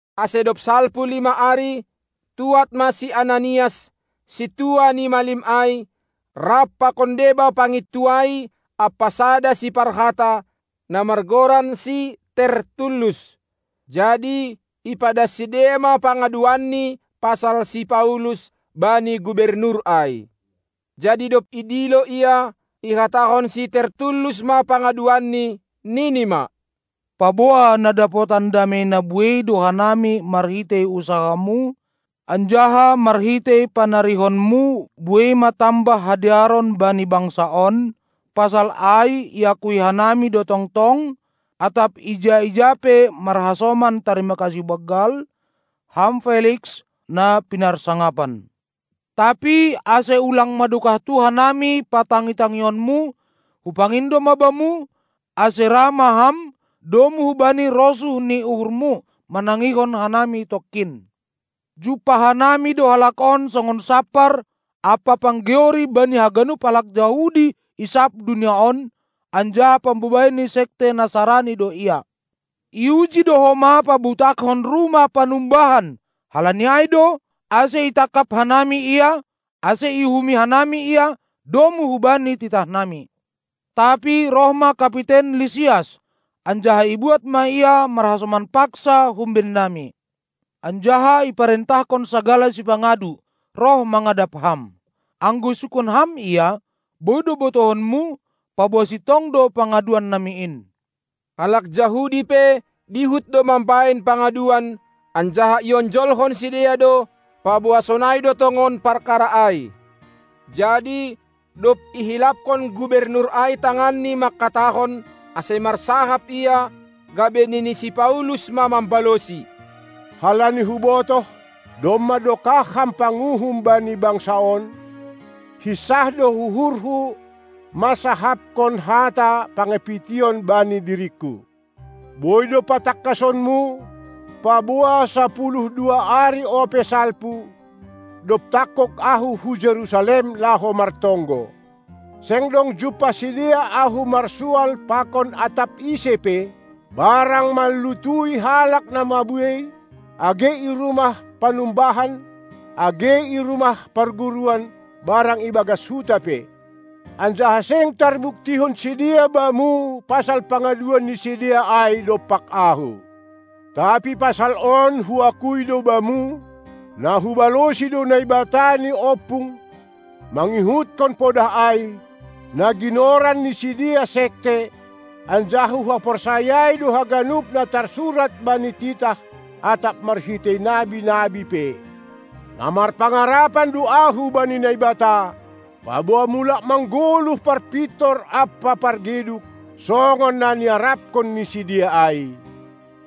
Ase dob salpu lima ari, tuad ma si Ananias, sintua ni malim ai, rap pakon deba pangintuai ampa sada siparhata, na margoran si Tertullus; jadi ipadas sidea ma pangaduanni pasal si Paulus bani gubernur ai. Jadi dob idilo ia, ihatahon si Tertullus ma pangaduanni, nini ma: Paboa na dapotan damei na buei do hanami marhitei usahamu, anjaha marhitei panarihonmu buei ma tambah hadearon bani bangsa on, pasal ai iakui hanami do tongtong atap ija-ija pe marhasoman tarima kasih banggal, ham Feliks, na pinarsangapan. Tapi ase ulang madokahtu hanami patangi-tangionmu, hupangindo ma bamu, ase ra ma ham, domu hubani rosuh ni uhurmu, manangihon hanami tongkin. Jumpah hanami do halak on songon sampar ampa panggeori bani haganup halak Jahudi i sab dunia on, anjaha pambobai ni sekte Nasarani do ia. Iuji do homa pabutakkon rumah panumbahan, halani ai do, ase itangkap hanami ia, ase iuhumi hanami ia domu hubani titahnami. Tapi roh ma kapiten Lisias, anjaha ibuat ma ia marhasoman paksa humbennami, anjaha iparentahkon sagala sipangadu roh mangadap ham. Anggo isungkun ham ia, boi do botohonmu, paboa sintong do pangaduannami in. Halak Jahudi pe dihut do mambahen pangaduan, anjaha ionjolhon sidea do, paboa sonai do tongon parkara ai. Jadi dob ihilaphon gubernur ai tanganni mangkatahon, ase marsahap ia, gabe nini si Paulus ma mambalosi: Halani hubotoh, domma dokah ham panguhum bani bangsa on, hinsah do uhurhu mansahapkon hata pangapition bani diringku. Boi do patangkasonmu, paboa sapuluh dua ari ope salpu, dob tangkog ahu hu Jerusalem laho martonggo. Seng dong jumpah sidea ahu marsual pakon atap ise pe, barang manlutui halak na mabuei, age i rumah panumbahan, age i rumah parguruan barang i bagas huta pe. Anjaha seng tarbuktihon sidea bamu pasal pangaduan ni sidea ai dompak ahu. Tapi pasal on huakui do bamu, na hubalosi do Naibata ni ompung, mangihutkon podah ai, na ginoran ni sidea sekte, anjaha huhaporsayai do haganup na tarsurat bani titah atap marhitei nabi-nabi pe. Na marpangarapan do ahu bani Naibata, paboa mulak manggoluh parpintor ampa pargeduk, songon na niarapkon ni sidea ai.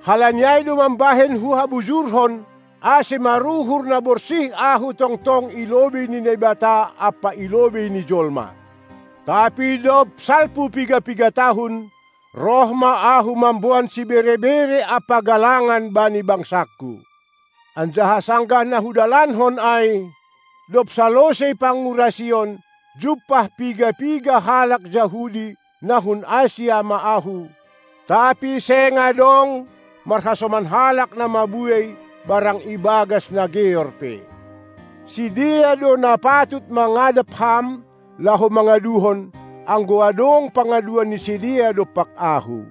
Halani ai do mambahen huhabujurhon, ase maruhur na borsih ahu tongtong i lobei ni Naibata ampa i lobei ni jolma. Tapi dob salpu piga-piga tahun, roh ma ahu mamboan sibere-bere ampa galangan bani bangsangku. Anjaha sanggah na hudalankon ai, dob salosei pangurasion, jumpah piga-piga halak Jahudi na hun Asia ma ahu, tapi seng adong marhasoman halak na mabuei barang ibagas na geor pe. Sidea do na patut mangadap ham laho mangaduhon, anggo adong pangaduan ni sidea dompak ahu.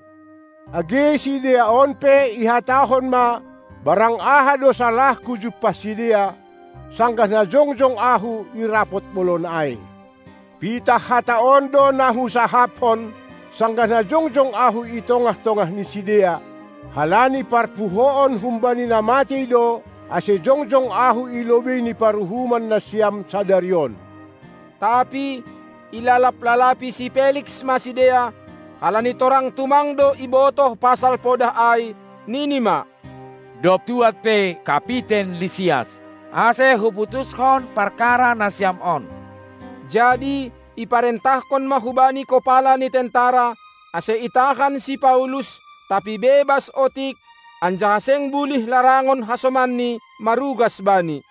Age sidea on pe ihatahon ma barang aha do salahku jumpah sidea, sanggah na jongjong ahu i rapot bolon ai. Pitah hata on do na husahapkon, sanggah na jongjong ahu i tongah-tongah ni sidea: Halani parpuhoon humbani na matei do, ase jongjong ahu i lobei ni paruhuman nasiam sadari on. Tapi ilalap-lalapi si Feliks ma sidea, halani torang tumang do ibotoh pasal podah ai, nini ma: Dob tuad pe kapiten Lisias, ase huputuskon parkara nasiam on. Jadi iparentahkon ma hubani kopala ni tentara, ase itahan si Paulus, tapi bebas otik, anjaha seng bulih larangon hasomanni marugas bani.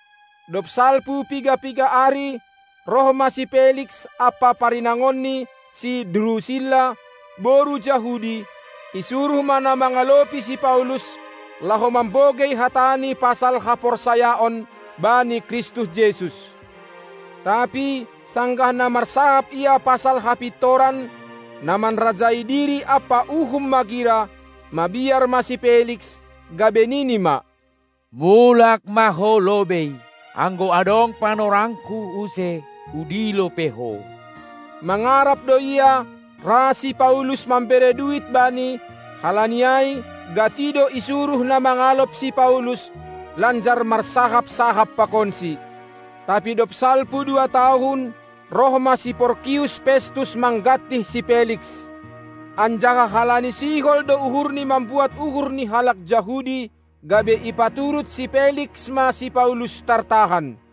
Dob salpu piga-piga ari, roh ma si Feliks ampa parinangonni si Drusilla, boru Jahudi; isuruh ma na mangalopi si Paulus, laho mambogei hatani pasal haporsayaon bani Kristus Jesus. Tapi sanggah na marsahap ia pasal hapintoran, na manrajai diri ampa uhum magira, mabiar ma si Feliks, gabe nini ma: Mulak ma ho lobei; anggo adong panorangku use, hudilo pe ho. Mangarap do ia, ra si Paulus mambere duit bani, halani ai gati do isuruh na mangalop si Paulus, lanjar marsahap-sahap pakonsi. Tapi dob salpu dua tahun, roh ma si Porkius Festus manggantih si Feliks. Anjaha halani sihol do uhurni mambuat uhur ni halak Jahudi, gabe ipaturut si Feliks ma si Paulus tartahan.